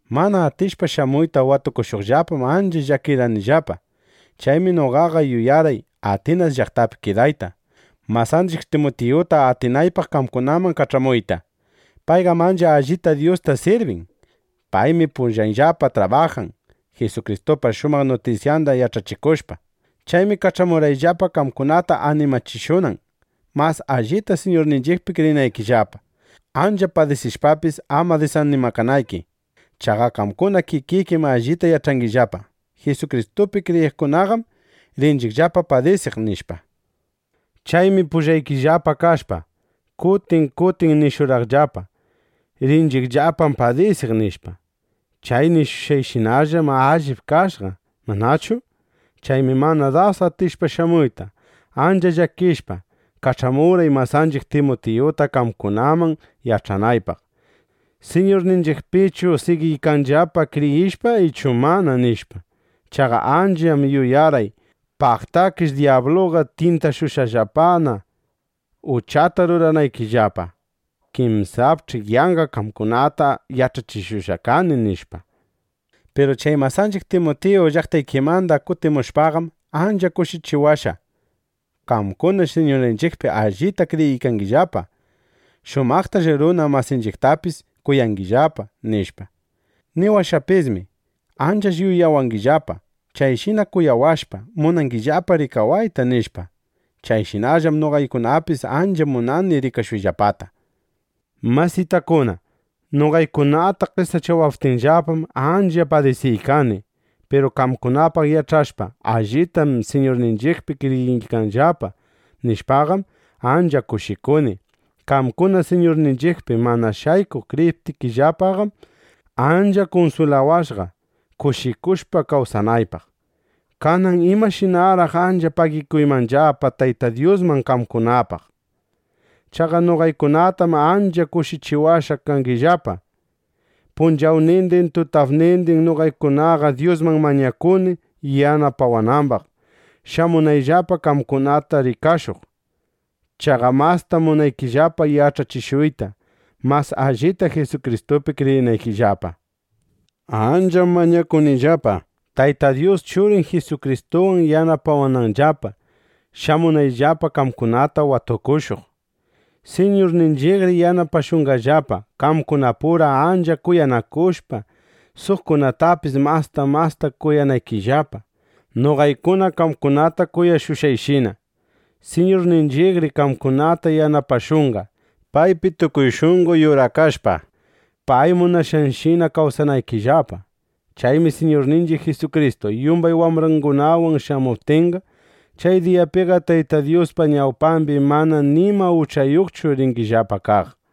Mana atishpa shamuyta watukushuqllapam, ancha llakirqanillapa. Chaymi noqaqa yuyarqay Atinas llaqtapi kidayta, masanchiq Timutiyuta atinaypaq qamkunaman kach'amuyta. Payqam ancha allita Dyusta sirbin. Paymi pullayllapa trabajan, Jisukristupa shumaq nutisyanda yach'achikushpa. Chaymi kach'amurqayllapa, qamkunata animachishunan, mas allita Siñurninchiqpi kriyinaykillapa, ancha padisishpapis, ama disanimakanayki. Chaqa qamkuna kikikim allita yach'angillapa: Jisukristupi kriyiqkunaqam rinchiqllapa padisiq, nishpa. Chaymi pullaykillapa kashpa, kutin kutin nishurqaqllapa: “Rinchiqllapam padisiq”, nishpa. Chay nishushqayshinallam allip kashqa, ¿manachu? Chaymi mana das atishpa shamuyta, ancha llakishpa, kach'amurqay masanchiq Timutiyuta qamkunaman, yach'anaypaq: ¿Siñurninchiqpichu sigiykangillapa kriyishpa ichu manana? nishpa. Chaqa ancham yuyarqay: Paqtakish dyabluqa tyintashushqallapa uchata ruranaykillapa. Kinsapch'i yanqa qamkunata yach'achishushqa kani, nishpa. Piru chay masanchiq Timutiyu llaqtaykimanda kutimushpaqam, ancha kushichiwashqa: Qamkunaqash Siñurninchiqpi allita kriyiykangillapa. Shumaqtash runa masinchiqtapis kuyangillapa, nishpa. Niwashqapismi: Anchash yuyawangillapa. Chayshi kuyawashpa, munangillapa rikawayta, nishpa. Chayshinallam noqaykunapis ancha munani rikashuyllapata. Masitakuna, noqaykunata qesachawaptinllapam, ancha padisiykani. Piru qamkunapaq yach'ashpa: Allitam Siñurninchiqpi kriyiykanllapa, nishpaqam, ancha kushikuni. Qamkuna Siñurninchiqpi mana shaykuq kriyiptikillapaqam, ancha kunswilawashqa, kushikushpa kawsanaypaq. Kanan ¿imashinaraq ancha pagikuymanllapa Tayta Dyusman qamkunapaq? ¡Chaqa noqaykunatam ancha kushichiwashqa kangillapa! Punchawnindin, tutapnindinmi noqaykunaqa Dyusman mañakuni yanapawanambaq, shamunayllapa qamkunata rikashuq. Chaqa mastam munanillapa yach'achishuyta, mas allita Jisukristupi kriyinaykillapa. Ancham mañakunillapa, Tayta Dyus Churin Jisukristuwan yanapawananllapa, shamunayllapa qamkunata watukushuq. Siñurninchiqri yanapashunqallapa, qamkunapura ancha kuyanakushpa, suqkunatapis masta masta kuyanaykillapa, noqaykuna qamkunata kuyashushqayshina. Siñurninchiqri qamkunata yanapashunqa, paypi tukuy shunqo yurakashpa, pay munashqanshina kawsanaykillapa. Chaymi Siñurninchiq Jisukristu yumbay wambrangunawan shamuptinqa, chay diyapiqa Tayta Dyuspa ñawpambi manana nima uchayuqchu ringillapa kaq.